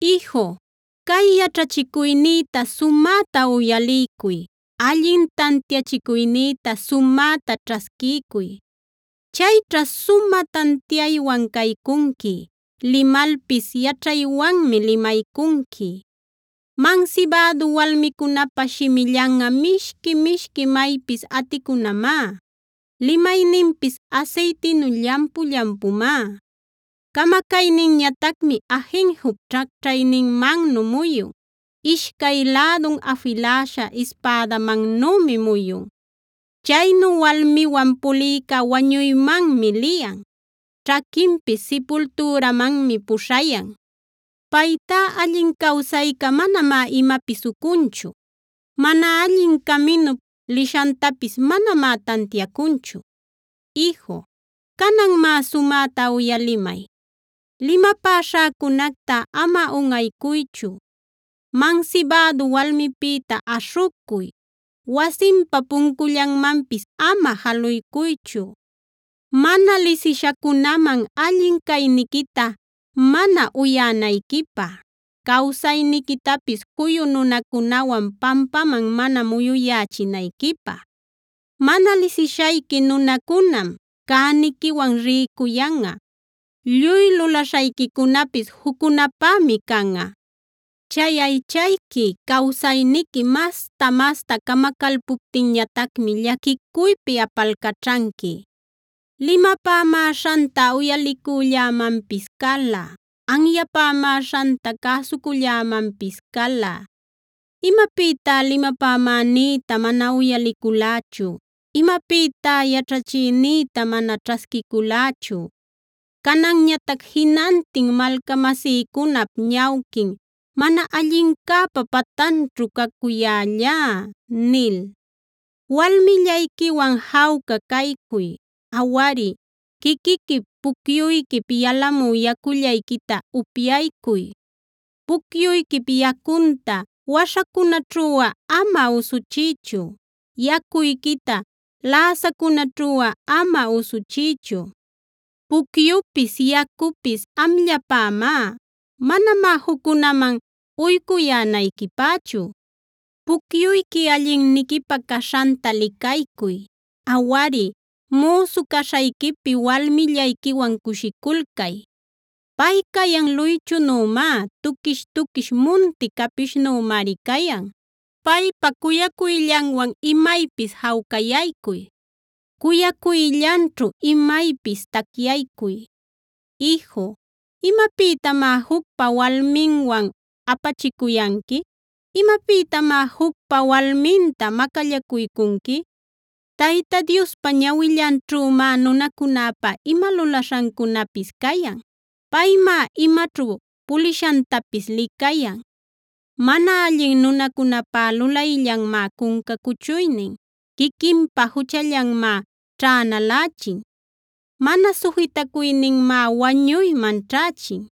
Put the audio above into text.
Iju, cay yaćhachicuynïta sumäta uyaliycuy; allin tantiachicuynïta sumäta ćhasquiycuy. Chayćha sumä tantiaywan caycunqui; limalpis yaćhaywanmi limaycunqui. Mansibädu walmicunäpa shimillanꞌa mishqui-mishqui maypis aticunamá; limayninpis asaytinu llampu-llampumá. Camacayninñatacmi ajinjup ćhacćhayninmannu muyun; ishcay lädun afiläśha ispädamannümi muyun. Chaynu walmiwan pulïca wañuymanmi liyan; ćhaquinpis sipultüramanmi puśhayan. Paytá allin cawsayca manamá imapis ucunchu; mana allin caminup lishantapis manamá tantiacunchu. Iju, canan má, sumäta uyalimay: limapäśhäcunacta ama unꞌaycuychu. Mansibädu walmipïta aśhucuy, wasinpa puncullanmanpis ama jaluycuychu, mana lisishacunaman allin cayniquita mana uyänayquipä, cawsayniquitapis juyu nunacunawan pampaman mana muyuyächinayquipä. Mana lisishayqui nunacunam cäniquiwan rïcuyanꞌa; lluy lulaśhayquicunapis juccunapämi canꞌa. Chay aychayqui, cawsayniqui masta-masta camacalpuptinñatacmá llaquicuypi apalcaćhanqui: “Limapämäśhanta uyalicullämanpis cala; anyapämäśhanta cäsucullämanpis cala. Imapïtá limapämänïta mana uyaliculächu; imapïtá yaćhachïnïta mana ćhasquiculächu. Cananñatac jinantin malcamasïcunap ñawquin mana allincäpa patanćhu cacuyällá” nil. Walmillayquiwan jawca caycuy; awari, quiquiquip pucyuyquip yalamü yacullayquita upyaycuy. Pucyuyquip yacunta waśhacunaćhuꞌa ama usuchiychu; yacuyquita läsacunäćhuꞌa ama usuchiychu. Pucyupis yacupis amllapämá; manamá juccunaman uycuyänayquipächu. Pucyuyqui allinniquipä caśhanta licaycuy; awari, müsu caśhayquipi walmillayquiwan cushiculcay. Pay cayan luychunümá; tuquish-tuquish munti capishnümari cayan. Paypa cuyacuyllanwan imaypis jawcayaycuy; cuyacuyllanćhu imaypis tacyaycuy. Iju, ¿imapïtamá jucpa walminwan apachicuyanqui? ¿Imapïtamá jucpa walminta macallacuycunqui? Tayta Diospa ñawillanćhümá nunacunäpa ima lulaśhancunapis cayan; paymá imaćhu pulishantapis licayan. Mana allin nunäpá lulayllanmá cunca cuchuynin; quiquinpa juchallanmá ćhänalächin. Mana sujitacuyninmá wañuyman ćhächin;